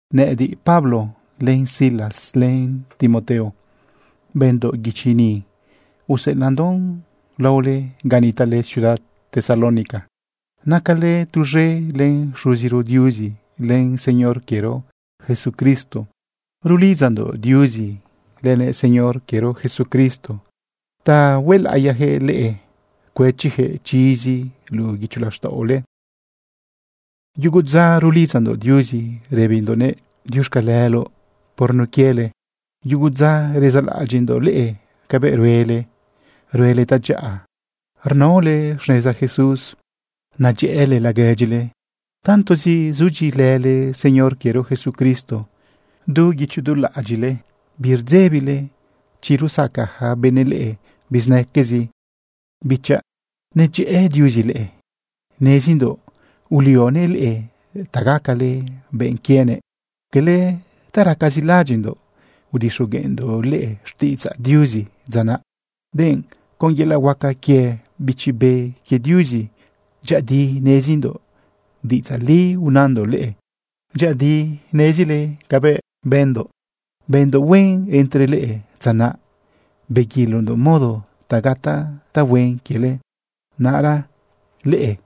Nëꞌëdiꞌ, Pablo, len Silas len Timoteo, bëndoꞌ guichi ni, useꞌelaꞌndoꞌn laole ga nitaꞌle ciudad Tesalónica. Nacale tuz̃e len Xuziro Diuzi len Señor quiero Jesucristo. Rulidzandoꞌ Diuzi lënëꞌ Señor quiero Jesucristo ta huelaꞌiyaquëꞌ leꞌe cuëchiyaquëꞌ chizi luꞌu guicho laxtaꞌole. Yugo dza rulidzandoꞌ Diuzi rëbindoꞌnëꞌ diuxcaleloꞌ por nun quiele. Yugu dza rezaꞌlaꞌadyiꞌndoꞌ leꞌe cabëꞌ ruele, ruele tadyaꞌa rnaole xneza Jesús, nedyëꞌële laguedyile. Tantozi zudyiꞌilële Señor quiero Jesucristo du guicho du laꞌadyiꞌle, birdzebile chi rusaca yaca benëꞌ leꞌe bizinaquezi. Bichaꞌ, nedyëꞌë Diuzi leꞌe. Nezindoꞌ ulionëꞌ leꞌe ta gacale benꞌ quienëꞌ. Cala ta racazi laꞌadyiꞌndoꞌ udixogueꞌndoꞌ leꞌe xtiꞌidzaꞌ Diuzi dza naꞌ, denꞌ con yelaꞌ huaca quie Bichi Be quie Diuzi. Dyëꞌëdi nezindoꞌ diꞌidzaꞌ li unandoꞌ leꞌe. Dyëꞌëdi nezile cabëꞌ bëndoꞌ, bëndoꞌ huen entre leꞌe dza naꞌ beguilondoꞌ modo ta gataꞌ tahuen quiele. Naꞌra leꞌe,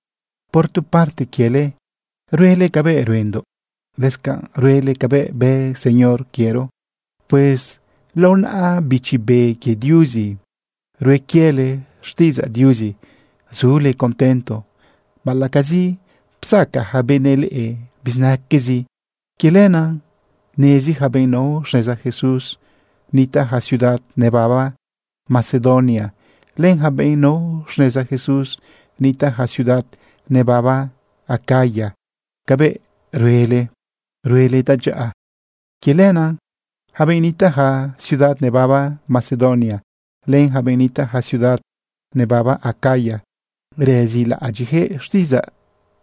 por tu parte quiele, ruele cabëꞌ ruendoꞌ, lëscanꞌ ruele cabëꞌ bë Señor quiero. Pues lao naꞌa Bichi Be quie Diuzi rue quiele xtiꞌidzaꞌ Diuzi zule contento, baꞌalaꞌcazi psacaꞌ yaca benëꞌ leꞌe bizinaquezi. Quie lenaꞌ nezi yaca benꞌ nao xneza Jesús nitaꞌ yaca ciudad nebaba Macedonia, len yaca benꞌ nao xneza Jesús nitaꞌ yaca ciudad nebaba Acaya cabëꞌ ruele, ruele tadyaꞌa. Quie lenaꞌ yaca benꞌ nitaꞌ yaca ciudad nebaba Macedonia, len yaca benꞌ nitaꞌ yaca ciudad nebaba Acaya, rezilaꞌadyiꞌyaquëꞌ xtiꞌidzaꞌ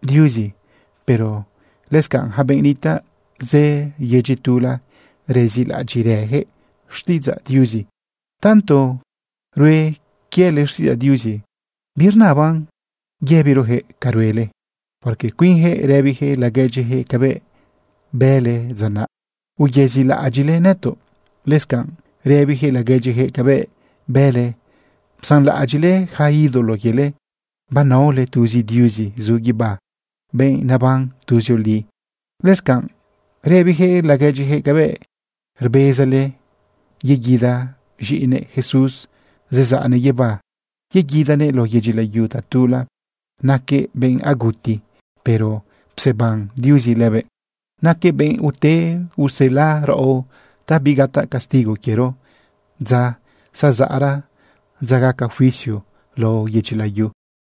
Diuzi, pero lëscanꞌ yaca benꞌ nitaꞌ zë yedyi tula, rezilaꞌadyiꞌrëyaquëꞌ xtiꞌidzaꞌ Diuzi. Tanto rue quiele xtiꞌidzaꞌ Diuzi, birnaban yëbiroyaquëꞌ ca ruele, porque cuinyaquëꞌ rëbiyaquëꞌ laguedyiyaquëꞌ cabëꞌ bële dza naꞌ, uyezilaꞌadyiꞌle nëtoꞌ. Lëscanꞌ rëbiyaquëꞌ laguedyiyaquëꞌ cabëꞌ bële psanlaꞌadyiꞌle yaca ídolo quiele, banaole tuzi Diuzi zu guibá, benꞌ neban tuzioli. Lëscanꞌ rëbiyaquëꞌ laguedyiyaquëꞌ cabëꞌ rbezale yeguida z̃iꞌinëꞌ Jesús zezaꞌnëꞌ guibá yeguidanëꞌ lao yedyi layu tatula. Naquëꞌ benꞌ aguti, pero pseban Diuzi lëbëꞌ. Naquëꞌ benꞌ ute usela raꞌo ta bigataꞌ castigo quiero dza zazaꞌra, dza gaca juicio lao yedyi layu.